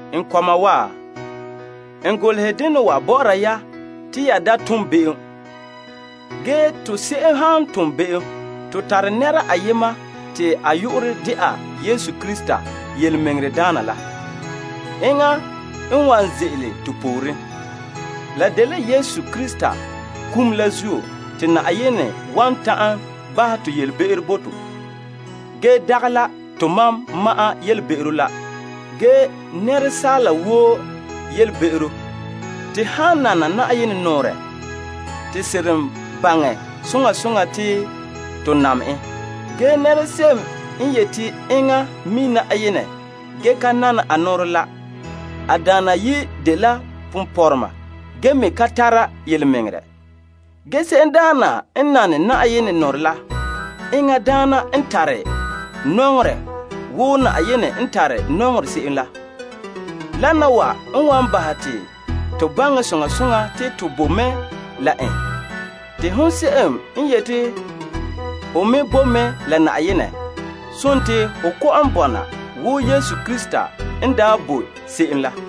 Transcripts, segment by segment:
N kɔma wa, n golehɛ dena wa bɔ'ɔra ya te ya da tom be'em. Ge to se'em han tom be'em, to tare Yesu Krista n de tontɔɔdaana la. Enŋa n de to nu'poŋmɛ'ɛra. La dela Yesu Krista kum la zuo te Yenɛ wan ta'an bahɛ to yelebe'ero bo to, dagɛ la tomam ma'an yelebe'ero la, ge asaala woo yelebe'ero. To han nana Yenɛ nɔɔrɛ to seren baŋɛ soŋa soŋa te to nam en. Ge se'em n yeti enŋa mi' Yenɛ ge ka nana a nɔɔrɛ la, a daana dela ponpɔrɔma, a ka tare yelemɛŋɛrɛ. Ge se'em n nane a nɔɔrɛ la, enŋa daana n tare nɔŋerɛ wo Yenɛ n tare nɔŋerɛ se'em la. Wana wa n wan bahɛ te to baŋɛ soŋa soŋa te to boe mɛ la en. Te hon se'em n yeti ho boe mɛ la Yenɛ, dela ho kɔ'ɔn bɔna wo Yesu Krista n daa boe se'em la.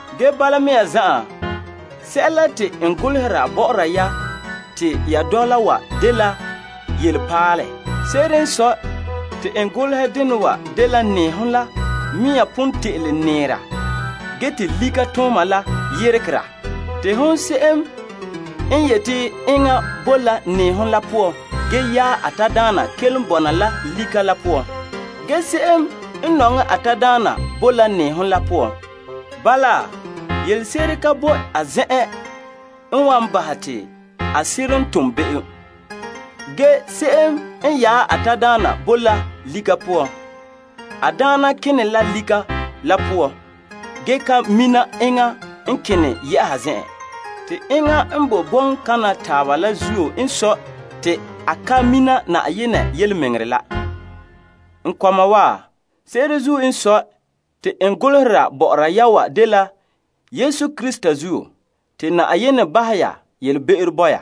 Ge bala mea zan'an, sɛla te n golehera bɔ'ɔra ya te ya dɔla wa dela yelepaalɛ. Se'ere n sɔe, te n golehɛ dena wa dela nɛɛhom la mea pon te'ele nɛɛra ge te lika la tɔla. Te se'em n yeti enŋa boe la nɛɛhom la poan ge yaɛ a tadaana kelom bɔna la lika la poan. Ge se'em n nɔŋɛ a tadaana boe la nɛɛhom la poan. Bala, yelese'ere ka boe a zen'en n wan bahɛ te a seren tom be'em. Ge se'em n yaɛ a tadaana boe la lika la poan, a daana kene la lika la poan, ge ka mina enŋa n kene yɛ'a zen'an. Te enŋa n boe bɔŋkaŋa taaba la zuo n sɔe te a ka mina Yenɛ yelemɛŋɛrɛ la. N kɔma wa, se'ere zuo n sɔe, te n golehera bɔ'ɔra ya wa dela Yesu Krista zuo, te Yenɛ bahɛ ya yelebe'ero bo ya.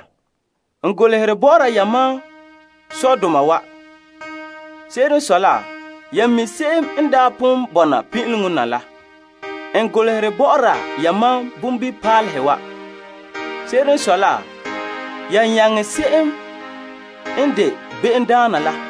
N golehere bɔ'ɔra yamam sɔdoma wa. Se'ere n sɔe la, ya mi' se'em n daa pon bɔna pin'ileŋɔ na la. N golehere bɔ'ɔra yamam bonbilipaalehe wa. Se'ere n sɔe la, ya nyaŋɛ se'em n de be'emdaana la.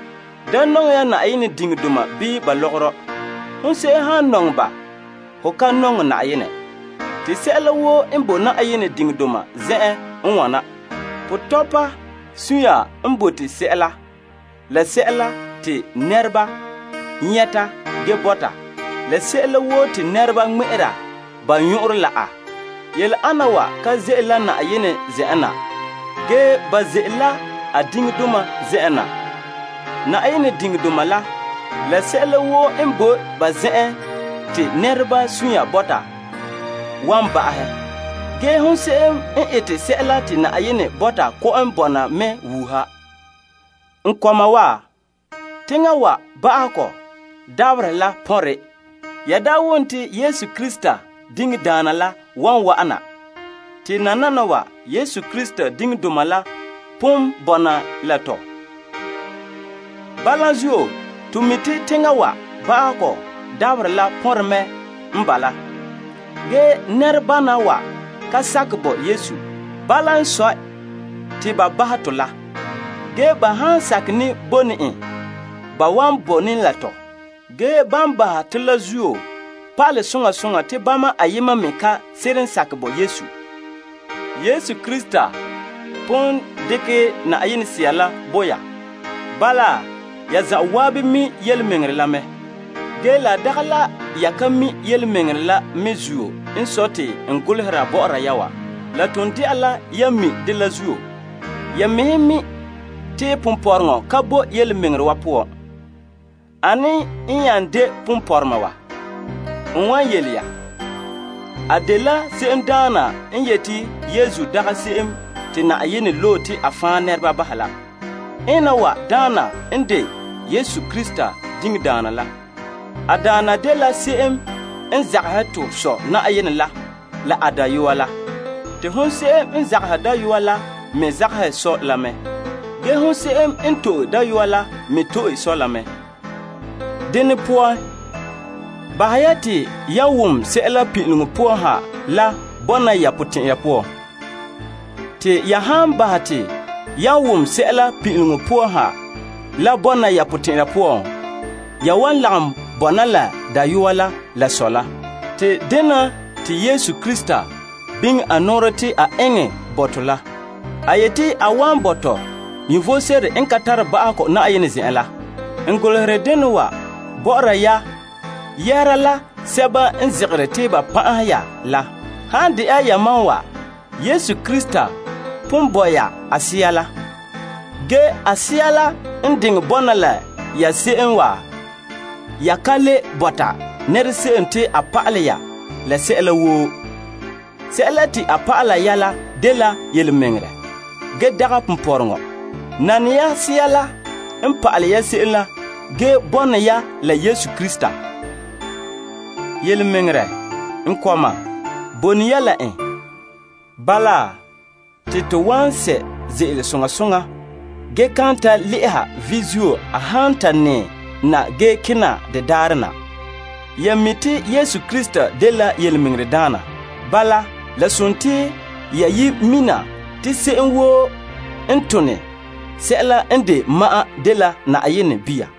Da nɔŋɛ ya teŋa wa zuo la ka lɔgɔrɔ. Hon se'em han nɔŋɛ ba, ho ka nɔŋɛ to Sɔ. Te sɛla woo n de teŋa wa zuo dene dela: potɔpa sunya n bote sɛla, la sɛla te nɛreba nyɛta ge bɔta, la sɛla woo te nɛreba ŋmɛ'ɛra ba nyɔn'ɔnrɔ la a. Yele ana wa ka ze'ele la to Sɔ zen'en na, ge ba ze'ele la a teŋa wa zuo na. Teŋa wa, la sɛla woo n boe ka poan te nɛreba nɔŋɛ la wan tole. Ge se'em n ete sɛla te Yenɛ bɔta kɔ'ɔn bɔna mɛ wuuha. N kɔma wa, teŋa wa ba'ahegɔ dabaherɛ la pɔnrɛ. Ya daa wom te Krista diŋdaana la wan wa'ana. Te nananawa, Krista diŋdoma la pon bɔna la tɔ. Bala zuo, to mi' te teŋa wa ba'ahegɔ dabaherɛ la pɔnre me n bala. Ge nɛrebana wa ka sakɛ bo Yesu. Bala n sɔe, te ba bahɛ tɔ la. Ge ba han sakɛ ne bo ne en, ba wan bone la tɔ. Ge ban bahɛ to la zuo pa'alɛ soŋa soŋa te bama ayema me ka seren sakɛ bo Yesu. Yesu Krista pon dekɛ Yenɛ Sea la bo ya. Bala, ya zan'an mi' yelemɛŋɛrɛ la mɛ. Ge la dagɛ la ya ka mi' yelemɛŋɛrɛ la me zuo n sɔe te n golehera bɔ'ɔra ya wa. La ton de'a la yan mi' dɛ la zuo. Ya mɛhe me mi' te ponpɔrɔŋɔ ka bo yelemɛŋɛrɛ wa poan. Ane nya n de ponpɔrɔma wa? N wan yele ya. A dela se'emdaana n yeti Yesu dagɛ se'em te Yenɛ loe la. Ena wa daana n de Yesu Krista diŋdaana la. A daana dela se'em n zagahɛ to Sɔ' la a Dayɔa la. Te hon se'em n zagahɛ Dayɔa la me zagahɛ Sɔ' la mɛ. Ge hon se'em n to'e Dayɔa la me to'e Sɔ' la mɛ. Dene poan, bahɛ ya te yan wom yelehom sebo pin'ileŋɔ poan ha la bɔna ya potɛn'ya poan. Te ya han bahɛ te yan wom sɛla pin'ileŋɔ poan ha la bɔna ya potɛn'ya poan, ya wan lagom bɔna la Dayɔa la la a Sɔ' la. Te dena te Yesu Krista biŋe a nɔɔrɛ te a eŋɛ bo to la. A yeti a wan bo to vom sebo n ka tare ba'ahegɔ Na'ayenɛ zen'en la. N golehere dena wa bɔ'ɔra ya yɛhera la sɛba n zegere te ba pan'ahera ya la. Han de'a yamam wa, Yesu Krista pon sɔ' ya la a Sea la. Sea la han bɔna la ya, ya ka le ɛɛra se'em te a pa'alɛ ya sɛla, sɛla te a pa'ala ya la dela yelemɛŋɛrɛ ge dagɛ ponpɔrɔŋɔ. Nane ya Sea la n pa'alɛ ya se'em la ge bone ya la Yesu Krista. Te yelemɛŋɛrɛ, n kɔma, bone ya la en. Bala, te to wan sɛ' ze'ele soŋa soŋa ge kan ta le'eha vi' zuo a han ta nɛɛ kena de daarɛ la na. Ya mi' te Krista dela tontɔɔdaana. Bala, ya mina te se'em woo n tone sɛla n de ma'an dela Yenɛ bia.